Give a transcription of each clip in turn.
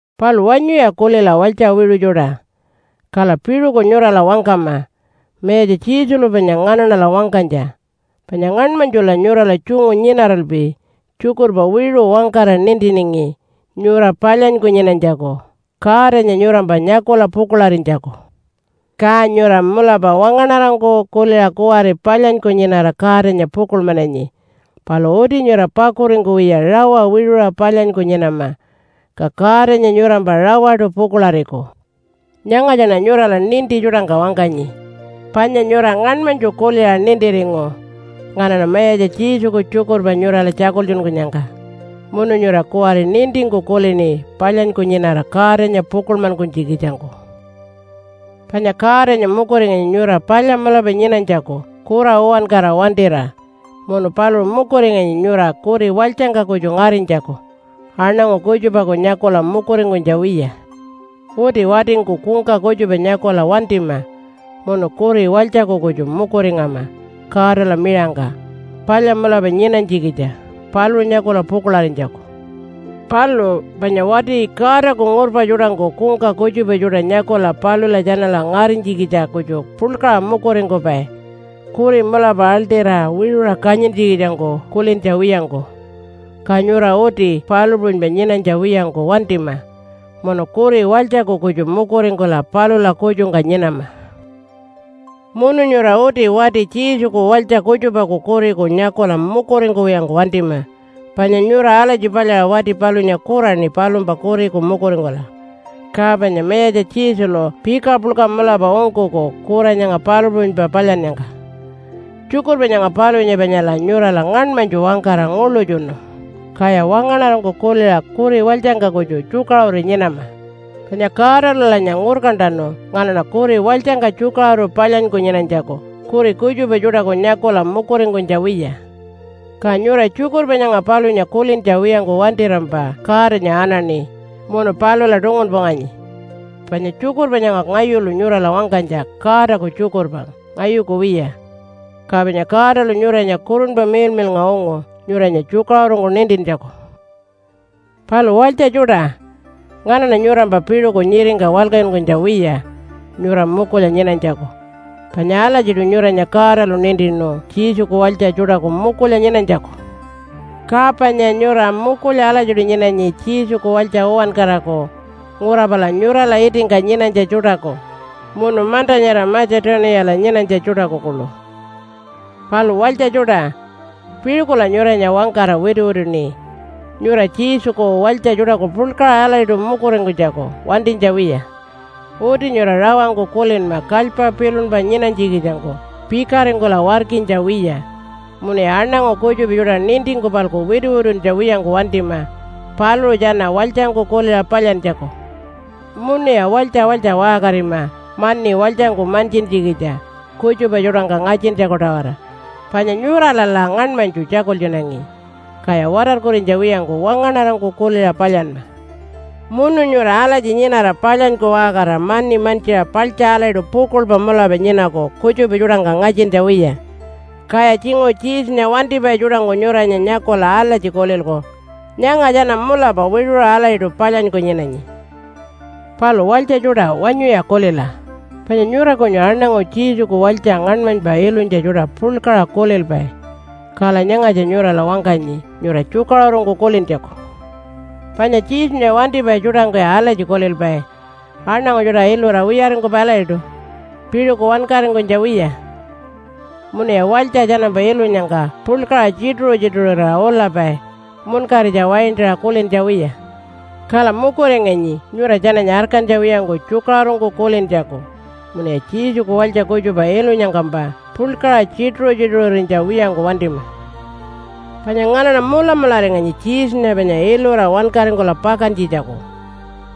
Palu wanyuya kulila walytja wiṟu tjuṯa, kala piṟuku nyurala wangkama Mayatja Jesulu panya nganaṉala wangkanytja. Panya ngaṉmanytjula nyurala tjungu nyinaralpi tjukurpa wiṟu wangkara nintiningi nyura palyanyku nyinanytjaku Godanya nyurampa nyakula pukuḻarinytjaku. Ka nyura mulapa wangaṉarangku kuliṟa kuwari palyanyku nyinara Godanya pukuḻmananyi. Palu uti nyura pakuringkuwiya rawa wiṟuṟa palyanyku nyinama, ka Godanya nyurampa rawaṯu pukuḻariku. Nyangatjaṉa nyurala ninti tjuṯangka wangkanyi, panya nyura ngaṉmanytju kuliṟa nintiringu nganaṉa Mayatja Jesuku tjukurpa nyurala tjakultjunkunyangka, munu nyura kuwari nintingku kulini palyanyku nyinara Godanya pukuḻmankunytjikitjangku. Panya Godanya mukuringanyi nyura palya mulapa nyinanytjaku kura uwankara wantira. Munu paluṟu mukuringanyi nyura kuri walytjangka kutju ngarinytjaku, aṉangu kutjupaku nyakula mukuringkunytja wiya. Uti watingku kungka kutjupa nyakula wantima munu kuri walytjaku kutju mukuringama Godala miṟangka palya mulapa nyinanytjikitja paluṟu nyakula pukuḻarinytjaku. Palu panya wati Godaku ngurpa tjuṯangku kungka kutjupa tjuṯa nyakula palula tjanala ngarinytjikitja kutju puḻkaṟa mukuringkupai, kuri mulapa aḻṯira wiṟuṟa kanyintjikitjangku kulintja wiyangku. Ka nyura uti palu puṟunypa nyinanytja wiyangku wantima, munu kuri walytjaku kutju mukuringkula palula kutjungka nyinama. Munu nyura uti wati Jesuku walytja kutjupaku kuriku nyakula mukuringkuwiyangku wantima, panya nyura alatji palyaṟa wati palunya kuraṉi palumpa kuriku mukuringkula. Ka panya Mayatja Jesulu pika puḻka mulapa ungkuku kura nyanga palu puṟunypa palyannyangka. Tjukurpa nyanga palunya panyala nyurala ngaṉmanytju wangkara nguḻutjunu, kaya wangaṉarangku kuliṟa kuri walytjangka kutju tjukaṟuru nyinama. Panya Godalulanya ngurkantanu nganaṉa kuri walytjangka tjukaṟuru palyanyku nyinanytjaku, kuri kutjupa tjuṯaku nyakula mukuringkunytja wiya. Ka nyura tjukurpa nyanga palunya kulintja wiyangku wantirampa Godanya anaṉi munu palula tungunpunganyi. Panya tjukurpa nyanga ngayulu nyurala wangkanytja Godaku tjukurpa, ngayuku wiya. Ka panya Godalu nyuranya Kurunpa Miḻmiḻnga ungu nyuranya tjukaṟurungku nintintjaku. Palu walytja tjuṯa, nganaṉa nyurampa piṟuku nyiringka walkatjunkunytja wiya nyura mukulya nyinanytjaku, panya alatjiṯu nyuranya Godalu nintinu Jesuku walytja tjuṯaku mukulya nyinanytjaku. Ka panya nyura mukulya alatjiṯu nyinanyi Jesuku walytja uwankaraku ngura pala nyurala itingka nyinanytja tjuṯaku munu manta nyara Matja-tuniyala nyinanytja tjuṯaku kuḻu. Palu walytja tjuṯa, piṟukula nyuranya wangkara wituwituṉi nyura Jesuku walytja tjuṯaku puḻkaṟa alatjiṯu mukuringkunytjaku wantinytja wiya. Uti nyura rawangku kulinma kalypa pilunpa nyinanytjikitjangku pikaringkula warkinytja wiya. Munuya aṉangu kutjupa tjuṯa nintingku-palku wituwituntja wiyangku wantima paluṟu tjana walytjangku kuliṟa palyantjaku. Munuya walytja walytja waṟkarima mani walytjangku mantjintjikitja kutjupa tjuṯangka ngatjintjaku-tawara. Panya nyuralala ngaṉmanytju tjakultjunangi, kaya watarkurinytja wiyangku wangaṉarangku kuliṟa palyanma. Munu nyura alatji nyinara palyanyku waṟkarira mani mantjiṟa paḻtja alatjiṯu pukuḻpa mulapa nyinaku kutjupa tjuṯangka ngatjintja wiya. Kaya tjinguṟu Jesunya wantipai tjuṯangku nyuranya nyakula alatji kulilku, “Nyanga tjana mulapa wiṟuṟa alatjiṯu palyanyku nyinanyi.” Palu walytja tjuṯa wanyuya kulila, panya nyura kunyu aṉangu Jesuku walytja ngaṉmanypa ilunytja tjuṯa puḻkaṟa kulilpai. Kala nyangatja nyurala wangkanyi nyura tjukaṟurungku kulintjaku. Panya Jesunya wantipai tjuṯangkuya alatji kulilpai aṉangu tjuṯa ilura wiyaringkupai alatjiṯu piṟuku wankaringkunytja wiya. Munuya walytja tjanampa ilunyangka puḻkaṟa tjituṟu-tjituṟurira ulapai munkaritja waintaṟa kulintja wiya. Kala mukuringanyi nyura tjananya arkantja wiyangku tjukaṟurungku kulintjaku munuya Jesuku walytja kutjupa ilunyangkampa puḻkaṟa tjituṟu-tjituṟurinytja wiyangku wantima. Panya nganaṉa mulamularinganyi Jesunya panya ilura wankaringkula pakantjitjaku.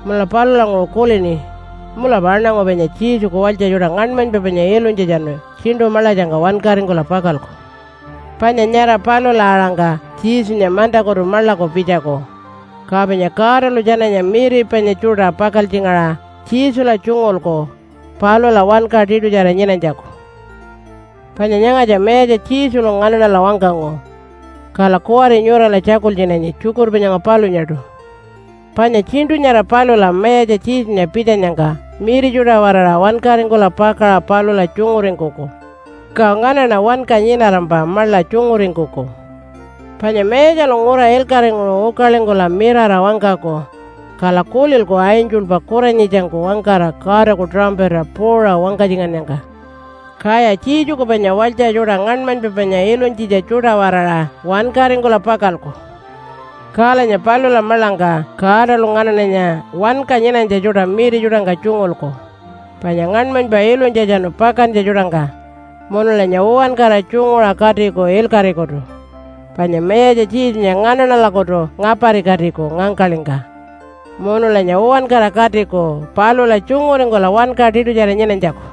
Munula palulanguṟu kulini mulapa aṉangu panya Jesuku walytja tjuṯa ngaṉmanypa panya ilunytjatjanu tjiṉṯu maḻatjangka wankaringkula pakalku. Panya nyara palula-aṟangka Jesunya mantakutu maḻaku pitjaku, ka panya Godalu tjananya miri panya tjuṯa pakaltjingaṟa Jesula tjungulku palula wanka tiṯutjara nyinanytjaku. Panya nyangatja Mayatja Jesulu nganaṉala wangkangu, kala kuwari nyurala tjakultjunanyi tjukurpa nyanga palunyaṯu. Panya tjiṉṯu nyara palula Mayatja Jesunya pitjanyangka miri tjuṯa-waraṟa, wankaringkula pakaṟa palula tjunguringkuku, ka nganaṉa wanka nyinarampa maḻa tjunguringkuku. Panya Mayatjalu ngura ilkaṟinguṟu ukalingkula mirara wangkaku, kala kulilku angelpa kuranyitjangku wangkara Godaku tuṟampata puuṟa wangkatjingannyangka. Kaya Jesuku panya walytja tjuṯa ngaṉmanypa panya ilunytjitja tjuṯa-waraṟa wankaringkula pakalku. Kalanya palula maḻangka Godalu nganaṉanya wanka nyinanytja tjuṯa miri tjuṯangka tjungulku, panya ngaṉmanypa ilunytjatjanu pakantja tjuṯangka, munulanya uwankara tjunguṟa katiku ilkaṟikutu. Panya Mayatja Jesunya nganaṉalakutu ngaparikatiku ngangkaḻingka, munulanya uwankara katiku palula tjunguringkula wanka tiṯutjara nyinanytjaku.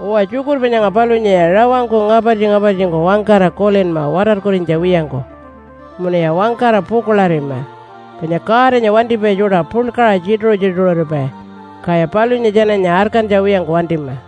Uwa, tjukurpa nyanga palunyaya rawangku ngapartji-ngapartjingku wangkara kulinma watarkurinytja wiyangku munuya wangkara pukuḻarima, panya Godanya wantipai tjuṯa puḻkaṟa tjituṟu-tjituṟuripai, kaya palunya tjananya arkantja wiyangku wantima.